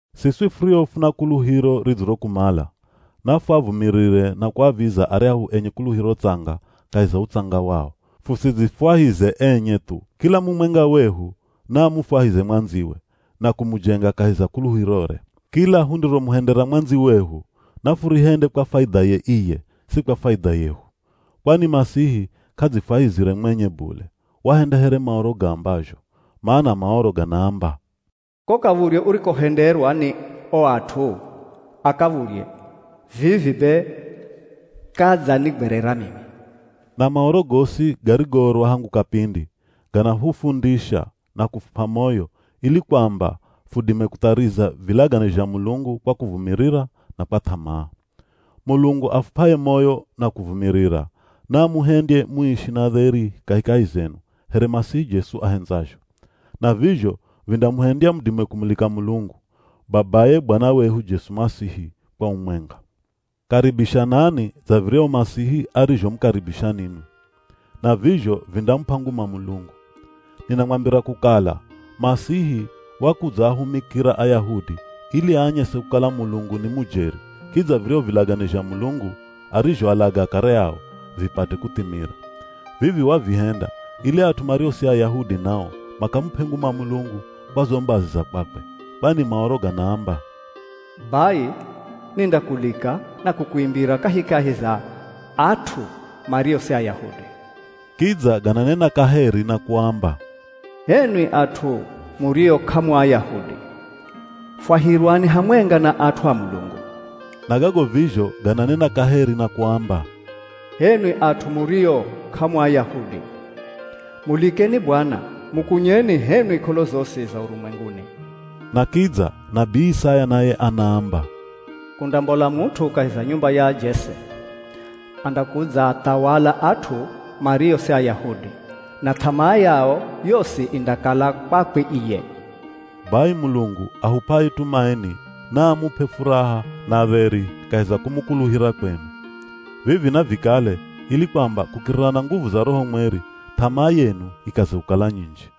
Siswi furio funa kuluhiro ridzirokumala, nafuavumirire na kuaviza aryahu enye kuluhiro tsanga kahi za utsanga wao, fusidzifwahize enye thu. Kila mumwenga wehu naamufwahize mwandziwe, na kumujenga kahi za kuluhirore. Kila hundiromuhendera mwandziwehu nafurihende kwa faidhaye iye, si kwa faidha yehu. Kwani Masihi k'adzifwahizire mwenye bule, wahenda here Maoro gaambazho. Mana Maoro ganaamba, “Ko kav̱udhye urikohenderwa ni o at'u a kav̱udhye, vivi be kadzanigwerera mimi.” Na Maoro gosi garigoorwa hangu kapindi ganahufundisha, na kufup'a moyo ili kwamba fudime kuthariza vilagane zha Mulungu kwa kuvumirira na kwa th'amaa. Mulungu afup'aye moyo na kuvumirira, naamuhendye muishi na dheri kahikahi zenu here Masihi Jesu ahendzazho. Na vizho vindamuhendya mudime kumulika Mulungu, Babaye Bwana wehu Jesu Masihi kwa umwenga. Karibishanani dza viryahu Masihi arizhomukaribisha ninwi. Na vizho vindamup'a nguma Mulungu. Ninamwambira kukala Masihi wakudzaahumikira Ayahudi ili aanyese kukala Mulungu ni mujeri, kidza viryahu vilagane zha Mulungu arizhoalaga akare ao, vipate kuthimira. Vivi wavihenda ili at'u mario si Ayahudi nao makamup'e nguma Mulungu kwa zo mbazi za kwakwe. Kwani Maoro ganaamba, “Bai, nindakulika na kukuimbira kahikahi za at'u mario si Ayahudi.” Kidza gananena kaheri na kuamba, “H'enwi at'u murio k'amu Ayahudi, fwahirwani hamwenga na at'u a Mulungu.” Na gago vizho gananena kaheri na kuamba, “H'enwi at'u murio k'amu Ayahudi, mulikeni Bwana, mukunyeni h'enwi k'olo zosi za urumwenguni.” Na kidza, nabii Isaya naye anaamba, “Kundambola mut'u kahi za nyumba ya Jese, andakudzaathawala at'u mario si Ayahudi, na th'amaa yao yosi indakala kwakwe iye.” Bai Mulungu ahup'aye tumaini naamup'e furaha na dheri kahi za kumukuluhira kwenu. Vivi navikale ili kwamba kukirira na nguvu za Roho Mweri th'amaa yenu ikaze kukala nyinji.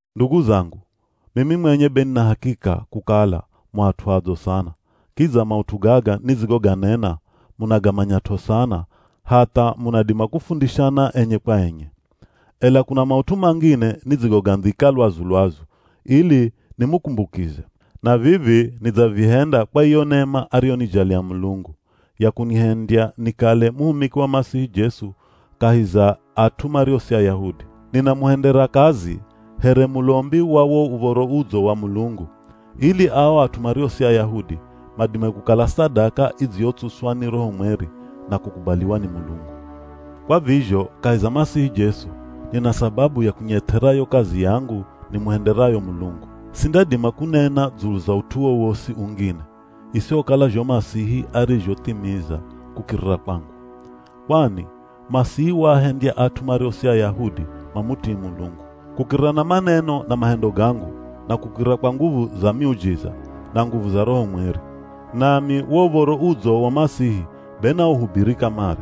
Ndugu zangu, mimi mwenye be nina hakika kukala mu at'u adzo sana, kidza maut'u gaga nidzigoganena munagamanyat'o sana hatha munadima kufundishana enye kwa enye. Ela kuna maut'u mangine nidzigogandhika lwazu-lwazu ili nimukumbukize. Na vivi nidzavihenda kwa iyo nema ariyonijalia Mulungu, ya kunihendya nikale muhumiki wa Masihi Jesu kahi za at'u mario si Ayahudi. Ninamuhendera kazi here mulombi wa wo Uv̱oro Udzo wa Mulungu, ili ao at'u mario si Ayahudi madime kukala sadaka idziyotsuswa ni Roho Mweri, na kukubaliwa ni Mulungu. Kwa vizho kahi za Masihi Jesu, nina sababu ya kunyeth'era yo kazi yangu nimuhenderayo Mulungu. Sindadima kunena dzulu za ut'u wowosi ungine, isihokala zho Masihi arizhothimiza kukirira kwangu. Kwani, Masihi waahendya at'u mario si Ayahudi mamutii Mulungu, kukirira na maneno na mahendo gangu, na kukirira kwa nguvu za miujiza, na nguvu za Roho Mweri. Nami wo Uv̱oro Udzo wa Masihi be nauhubiri kamare.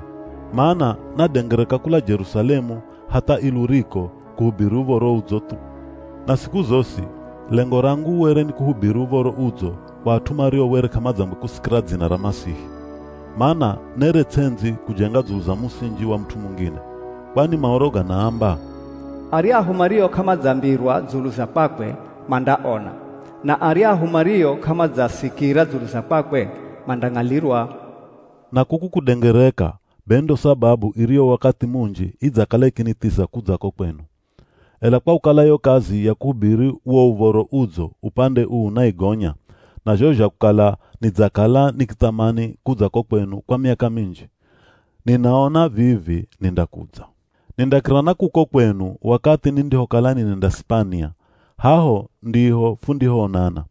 Mana nadengereka kula Jerusalemu hatha Iluriko kuhubiri Uv̱oro Udzo thu. Na siku zosi, lengo rangu were ni kuhubiri Uv̱oro Udzo kwa at'u mario were k'amadzangwe kusikira dzina ra Masihi. Mana nere ts'endzi kujenga dzulu za musinji wa mut'u mungine. Kwani Maoro ganaamba, “Aryahu mario k'amadzambirwa dzulu za kwakwe, mandaona; Na aryahu mario k'amadzasikira dzulu za kwakwe, mandang'alirwa.” Na kuku kudengereka be ndo sababu iriyo wakathi munji idzakala ikinithiza kudza ko kwenu. Ela kwa kukala yo kazi ya kuhubiri wo Uv̱oro Udzo upande uu naigonya, na zho zha kukala nidzakala nikithamani kudza ko kwenu kwa miaka minji, ninaona vivi nindakudza. Nindakira na kuko kwenu wakathi nindihokala ninenda Sipania, haho ndiho fundihoonana.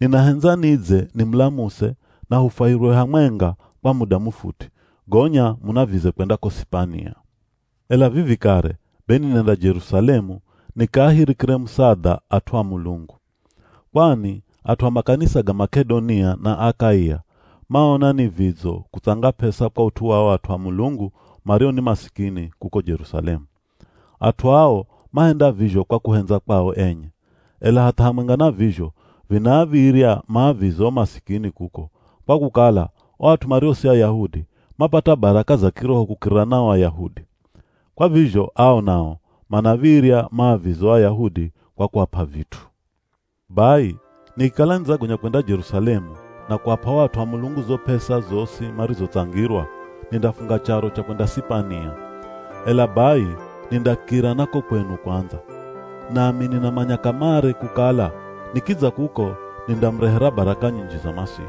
Ninahendza nidze nimulamuse na hufwahirwe hamwenga kwa muda mufuti, gonya munavize kwenda ko Sipania. Ela vivi kare be ninenda Jerusalemu nikaahirikire musadha at'u a Mulungu. Kwani at'u a makanisa ga Mak'edonia na Akaia, maona ni vidzo kutsanga p'esa kwa ut'u wa o at'u a Mulungu mario ni masikini kuko Jerusalemu. At'u ao mahenda vizho kwa kuhendza kwao enye. Ela hatha hamwenga na vizho vinaav̱irya maavize o masikini kuko, kwa kukala, o at'u mario si Ayahudi, mapata baraka za kiroho kukirira na o Ayahudi. Kwa vizho ao nao manav̱irya maavize o Ayahudi kwa kuap'a vit'u. Bai, nikikala nidzagonya kwenda Jerusalemu na kuap'a o at'u a Mulungu zo p'esa zosi marizotsangirwa, nindafunga charo cha kwenda Sipania, ela bai nindakira na ko kwenu kwandza. Nami ninamanya kamare kukala nikidza kuko nindamurehera baraka nyinji za Masihi.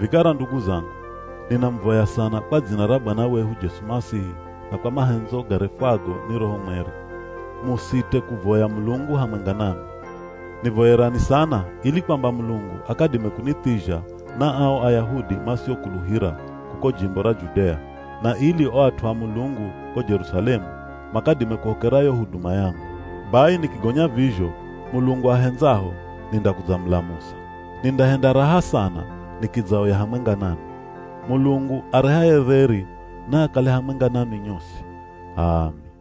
Vikara ndugu zangu, ninamuvoya sana kwa dzina ra Bwana wehu Jesu Masihi na kwa mahendzo garefwago ni Roho Mweri, musite kuvoya Mulungu hamwenga nami. Nivoyerani sana ili kwamba Mulungu akadime kunithizha na ao Ayahudi masiokuluhira kuko jimbo ra Judea, na ili o at'u a Mulungu ko Jerusalemu makadime kuhokera yo huduma yangu. Bai nikigonya vizho, Mulungu ahendzaho nindakudzamulamusa. Nindahenda raha sana nikidzaoya hamwenga nanwi. Mulungu arehaye dheri naakale hamwenga nanwi nyosi. H'aami.